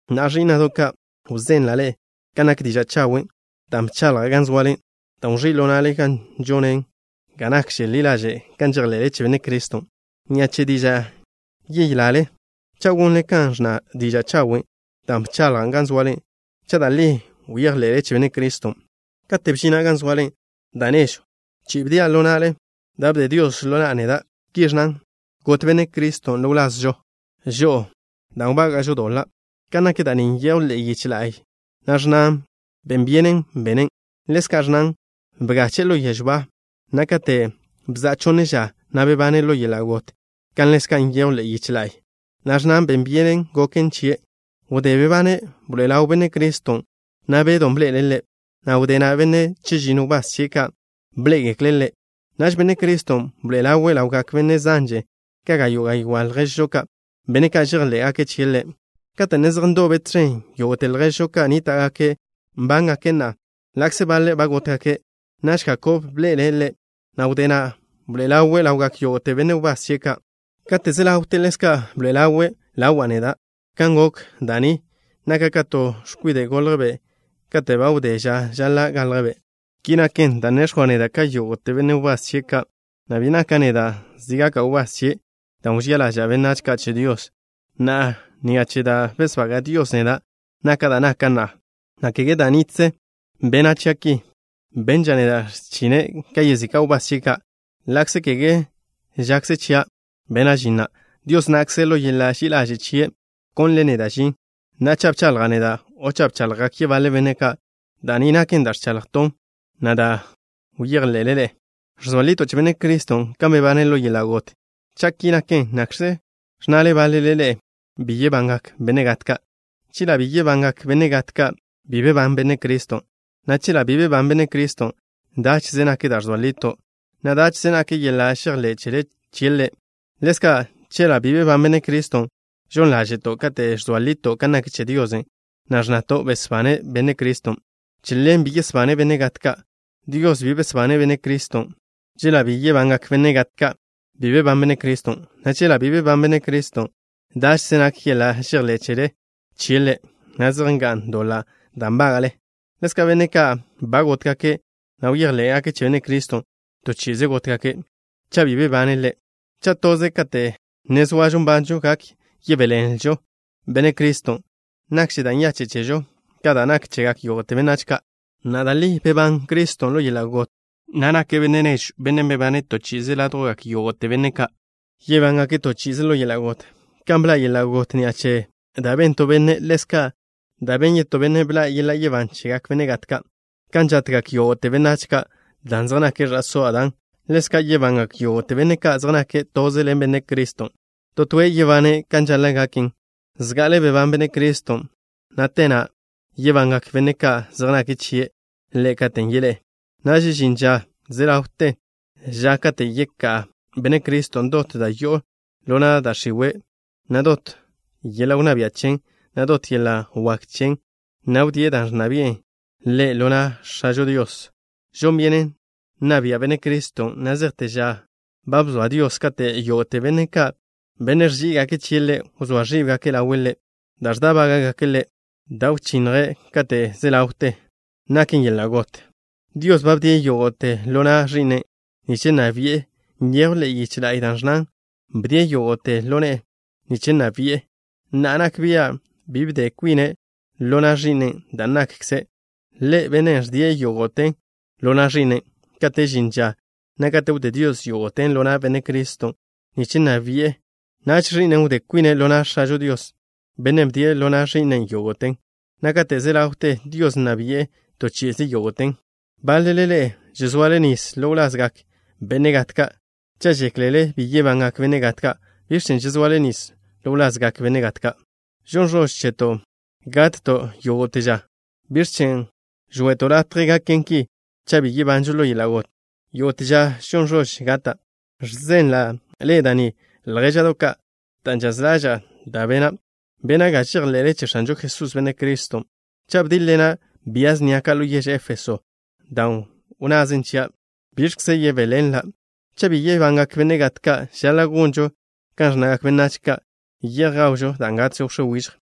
Na'a, ẕí'na'do' ka', wzenla' ḻe'e kan nak diža' chawen' da' bchaḻja' gan zoale, dan' wẕí' ḻo na'le, na' žonen ga nakže ḻi ḻaže' kan žejḻe'le che Benne' Criston'. Ni'a che dižan' yelale, cha' gonle kan ẕnna diža' chawen' dan' bchaḻjan' gan zoale, cha' da' li bejḻe'le che Benne' Criston'. Kate' bžina' gan zoale da' nežw chi'i bdia' ḻo na'le da' bde Dios ḻo na'a neda'. Ki ẕnnan: “Got Benne' Criston' ḻo wlazžo žo'o dan' wbága'žo doḻa'.” Kan nak da' ni nyejw ḻe'e yiche la'y, na' ẕnnan ben byenen benen'. Ḻezka' ẕnnan: “Bgache'e ḻo yežw ba, na' kate' bza'a chonne ža, na' bebane' ḻo yeḻa' got” kan ḻezka' nyejw ḻe'e yiche la'y, na' ẕnnan ben byenen goken chie'. Wdé bebane' bḻoe'e ḻaw Benne' Criston', na' Bedon' bḻe'ele' Ḻe', na' wdé na', benne' chežinno wbás chie' ka' bḻé'egekle' Ḻe'. Naž Benne' Criston' bḻoe'e ḻawe' ḻawgak benne' zanže ka gayo' gaywá' lježžo ka', benne' ka' žejḻé'gake' chie' Ḻe', kate' ne zej ndobe' tẕen. Yógo'te lježžo ki nníta'gake' nbángake' na'a, ḻa'kze baḻe' ba gótgake'. Naž Jakob bḻe'ele' Ḻe', na' wdé na' bḻoe'e ḻawe' ḻawgak yógo'te benne' wbás chie' ka'. Kate' ze ḻawte ḻezka' bḻoe'e ḻawe' ḻawa' neda'. Kan gok da' ni, naka' ka to x̱kwide' goljbe' kate' ba wdé ža žaḻa' galjbe'. Ki naken dan' nex̱jwa' neda' ka yógo'te benne' wbás chie' ka', na' bi naka' neda' zi gaka' wbás chie', dan' wžía ḻaža'a benách ka' che Dios. Na'a, ni'a che da' besbaga' Dios neda', naka' da' naka' na'a, na' kege da' nitze bene' chia' ki. Benža' neda' x̱chine' ka yezika' wbás chie' ka', ḻa'kze kege žakze chia' bena' žin na'. Dios na'kze, ḻo yeḻa' ži'i ḻaže' chie', bkonle' neda' žin. Na'a, cha' bchaḻja' neda' o cha' bchaḻjgak yebaḻe benne' ka', da' ni naken da' ẕchaḻjton', na' da' bejḻe'le ḻe'e. Ẕzoa lito' che Benne' Criston' kan bebane' ḻo yeḻa' got. Cha' ki naken, ¿nakx̱kze ẕnnale báḻele ḻe'e: “Bi yebangak benne' gat ka'?” Chela' bi yebangak benne' gat ka', bi bebán Benne' Criston', na' chela' bi bebán Benne' Criston', dáche'ze nak da' ẕzoa lito', na' dáche'ze nak yeḻa' žejḻé' chele chie' Ḻe'. Ḻezka', chela' bi bebán Benne' Criston', žon ḻáže'to' kate' ẕzoa lito' kan nak che Dios, na' ẕnnato' besbane' Benne' Criston'. Chela' bi yesbane' benne' gat ka', Dios bi besbane' Benne' Criston'. Chela' bi yebangak benne' gat ka', bi bebán Benne' Criston', na' chela' bi bebán Benne' Criston', dáche'ze nak yeḻa' žejḻé' chele chie' Ḻe', na' zej nga'n doḻa' da' nbága'le. Ḻezka', benne' ka' ba gótgake', na' bejḻé'gake' che Benne' Criston', to chi'ize gótgake' cha' bi bebane' Ḻe'. Cha' toze kate' ne zoažo nbanžo gak yebéḻenlžo Benne' Criston', nakže da' nyache' chežo ka da' nak chegak yógo'te benách ka'. Na'a, da' li bebán Benne' Criston' ḻo yeḻa' got, na' nake' Benne' nežw, bennen' bebane' to chi'ize ládjwgak yógo'te benne' ka' yebángake' to chi'ize ḻo yeḻa' got. Kan bḻa' yeḻa' got ni'a che da' ben to benne', ḻezka', ni'a che da' ben yetó benne' bḻa' yeḻa' yebán chegak benne' gat ka'. Kan žatgak yógo'te benách ka' dan' zej nake' ẕa'só Adán, ḻezka' yebangak yógo'te benne' ka' zej nake' toze ḻen Benne' Criston'. To toe' yebane' kan žaḻa' gaken. Zga'ale bebán Benne' Criston', na' te na'a yebangak benne' ka' zej nake' chie' Ḻe' katen' yeḻé'e. Naž žin ža ze ḻawte ža kate' yeká' Benne' Criston' dot da' yo'o ḻo na' da' x̱iwe', na' dot yeḻa' wnná bia' chen, na' dot yeḻa' wak chen, na' wdíe' da' ẕnna bi'e Ḻe' ḻo na' X̱ažo Dios. Žon byenen nna bia' Benne' Criston' na' zejte ža ba bzoa Dios kate' yógo'te benne' ka', benne' ẕží'igake' chie' Ḻe', wzóa ẕíbgake' ḻawe' Ḻe'. Da' ẕdá'baga' Ḻe', da' wchinnje' kate' ze ḻawte, naken yeḻa' got. Dios ba bdie' yógo'te ḻo na' Ẕi'nen' nich nna bi'en. Nyejw ḻe'e yiche la'y da' ẕnnan: “Bdie' yógo'te ḻo ne'e nich nna bi'en.” Na'a, nak bia' bi bde kwine' ḻo na' Ẕi'nen', dan' nakkze' Ḻe' Bennen' ẕdie' yógo'ten ḻo na' Ẕi'nen'. Kate' žin ža na' kate' wdé Dios yógo'ten ḻo na' Benne' Criston' nich nna bi'en, naž Ẕi'nen' wdé kwine' ḻo na' X̱ažo Dios, Bennen' bdie' ḻo na' Ẕi'nen' yógo'ten, na' kate' ze ḻawte, Dios nna bi'e to chi'ize yógo'ten. Báḻele ḻe'e žezoale nis ḻo wlazgak benne' gat ka'. Cha' žéklele bi yebangak benne' gat ka', ¿biẕ chen' žezoale nis ḻo wlazgak benne' gat ka'? Žon ẕož cheto' gatto' yógo'te ža. ¿Biẕ chen' žwe'to' latje gaken ki cha' bi yebanžo ḻo yeḻa' got? Yógo'te ža žon ẕož gata'. Ẕzenla' ḻe'e da' ni, ljéža'do' ka', dan' žaz ḻaža'a da' bena'. Bena' ga žejḻe'le che X̱anžo Jesús, Benne' Criston'. Cha' bdíḻ-ḻena' bia snia ka' ḻo yež Éfeso dan' wnnazen chia', ¿biẕkze yebéḻenla'? Cha' bi yebangak benne' gat ka', žaḻa' gonžo kan ẕnnagak benách ka': “Ye'j gawžo dan' gatžo wx̱é wižj.”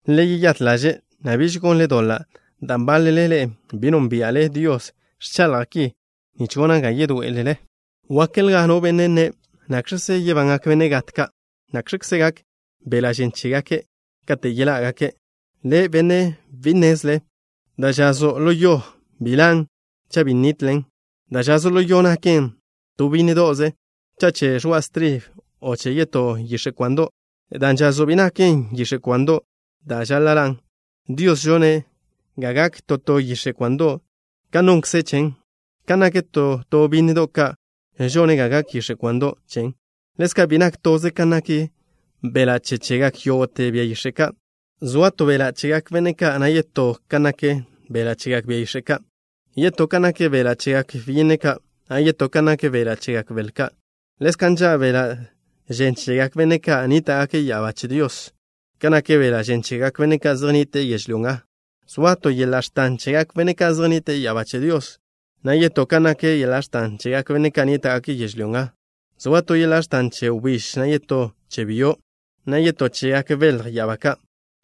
Le yeyát ḻaže', na' biž gonle doḻa' dan' báḻele ḻe'e bi nónbia'le Dios. Ẕchaḻja' ki nich gona' ga yedoé'elele. Wákelja no benne' nne': “¿Nakx̱kze yebangak benne' gat ka'? ¿Nakx̱kze gak beḻa' žen chégake' kate' yeḻá'gake'?” Le', benne' bi nnezle. Da' žazo' ḻo yo bi ḻan' cha' bi nitlen. Da'žazo' ḻo yo naken to bínnedo'ze, cha' che ẕoa' stribe, o che yetó yix̱e' kwando'. Dan' žazo' bi naken yix̱e' kwando' da' žaḻa' ḻan'. Dios žone' ga gak to to yix̱e' kwando' kan nonkze' chen. Kan nak to to bínnedo' ka' žone' ga gak yix̱e' kwando' chen. Ḻezka', bi nak toze kan nak beḻa' che chegak yógo'te bia yix̱e' ka'. Zoa to beḻa' chegak benne' ka', na' yetó kan nak beḻa' chegak bia yix̱e' ka'. Yetó kan nak beḻa' chegak byinne ka', na' yetó kan nak beḻa' chegak bel ka'. Ḻezka' nža' beḻa' žen chegak benne' ka' nníta'gake' ya'abá che Dios ka nak beḻa' žen chegak benne' ka' zej nnite'e yežlyó nga. Zoa to yeḻa' x̱tan chegak benne' ka' zej nnite'e ya'abá che Dios, na' yetó kan nak yeḻa' x̱tan chegak benne' ka' nníta'gake' yežlyó nga. Zoa to yeḻa' x̱tan che wbíž, na' yetó che byo', na' yetó chegak belj ya'abá ka'.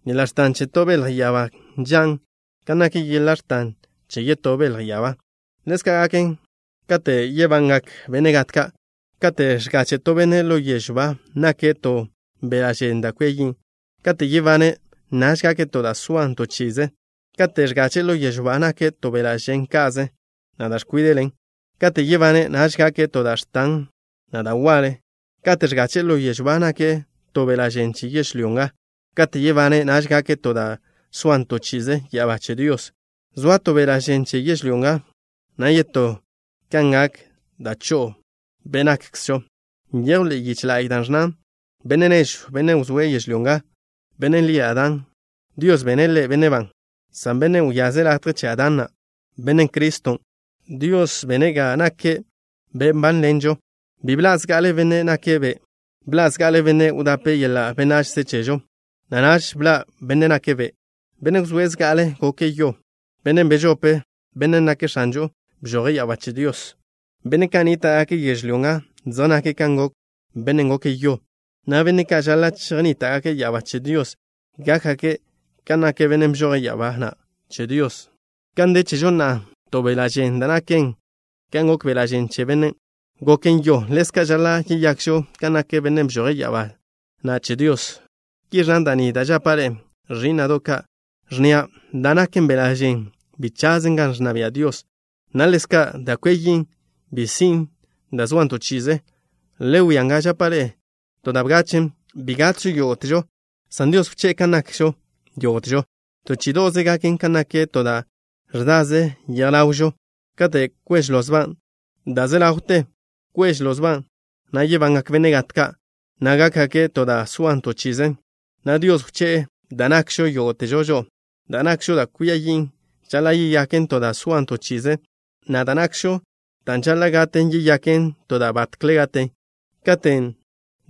Yeḻa' x̱tan che to belj ya'abá nžan' kan nak yeḻa' x̱tan che yetó belj ya'abá. Ḻezka' gaken kate' yebangak benne' gat ka'. Kate' ẕgache' to benne' ḻo yežw ba nake' to beḻa' žen da' kwia yin'. Kate' yebane', naž gake' to da' soan to chi'ize. Kate' ẕgache'e ḻo yežw ba nake' to beḻa' žen ka'ze, na' da' ẕkwíde'len. Kate' yebane', naž gake' to da' x̱tan, na' da' waḻe. Kate' ẕgache'e ḻo yežw ba nake' to beḻa' žen che yežlyó nga. Kate' yebane', naž gake' to da' soan to chi'ize ya'abá che Dios. Zoa to beḻa' žen che yežlyó nga, na' yetó kan gak da' cho'o be' nakkzžo. Nyejw ḻe'e yiche la'y da' ẕnnan: “Benne' nežw, benne' wzóe' yežlyó nga, bennen' lie' Adán, Dios bene' ḻe' benne' ban” san Bennen' wyaze' latje che Adán na', Benne' Criston', Dios bene' ga nake' Be' nbánḻenžo. Bi bḻa' zga'ale Benne' nake' Be'. Bḻa' zga'ale bennen' wdape' yeḻa' benachze chežo, na' naž bḻa' Benne' nake' Be'. Bennen' wzóe' zga'ale', goke' yo. Bennen' bežope', Bennen' nake' X̱anžon', bžoje' ya'abá che Dios. Benne' ka' nníta'gake' yežlyó nga zej nake' kan gok bennen' goke' yo, na' benne' ka' žaḻa' chejnníta'gake' ya'abá che Dios gákgake' kan nak Bennen' bžoje' ya'abá na' che Dios. Kan de chežo na'a to beḻa' žen da' naken kan gok beḻa' žen che bennen' goke' yo, ḻezka' žaḻa' yeyakžo kan nak Bennen' bžoje' ya'abá na' che Dios. Ki ẕnna da' ni da' žapa' ḻe'e, ẕí'na'do' ka', ẕnnia': da' naken beḻa' žen bi chazen gan ẕnna bia' Dios, na' ḻezka', da' kwia yin' bi sin' da' zoan to chi'ize. Le wia nga, žapa' ḻe'e to da' bgachen': bi gatžo yógo'težo, san Dios wché'e kan nakžo yógo'težo. To chí'ido'ze gaken, kan nak to da' ẕdaze yej ḻawžo, kate' kwež lozban' da' ẕze ḻawten. Kwež lozban', na' yebangak benne' gat ka', na' gákgake' to da' soan to chi'ize, na' Dios wché'e da' nakžo yógo'težo žo'o. Da' nakžo da' kwia yin' žaḻa' yeyaken to da' soan to chi'ize, na' da' nakžo, dan' žaḻa' gaten, yeyaken to da' batkle gaten. Katen'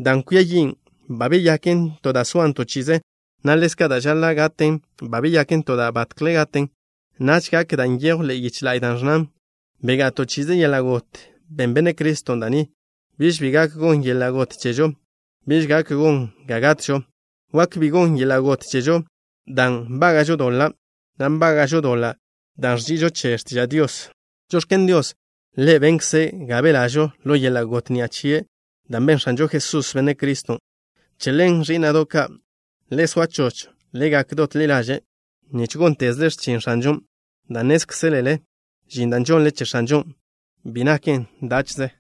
dan' kwia yin' ba beyaken to da' soan to chi'ize, na' ḻezka' dan' žaḻa' gaten ba beyaken to da' batkle gaten, naž gak dan' nyejw ḻe'e yiche la'y da' ẕnnan: Begá'a to chi'ize yeḻa' got. Ben Benne' Criston' da' ni. Biž bi gak gon yeḻa' got chežo. Biž gak gon ga gatžo. Wak bi gon yeḻa' got chežo dan' nbága'žo doḻa', na' nbága'žo doḻa' dan' ẕži'ižo che x̱tiža' Dios. Žox̱ken Dios. Ḻe' benkze' ga belažo ḻo yeḻa' got ni'a che da' ben X̱anžo Jesús, Benne' Criston'. Che ḻen, ẕí'na'do' ka', le soa choch. Le gak dot ḻi ḻaže' nich góntezle x̱chin X̱anžon' dan' nnézkzelele žin da' žonle che X̱anžon' bi naken dáche'ze.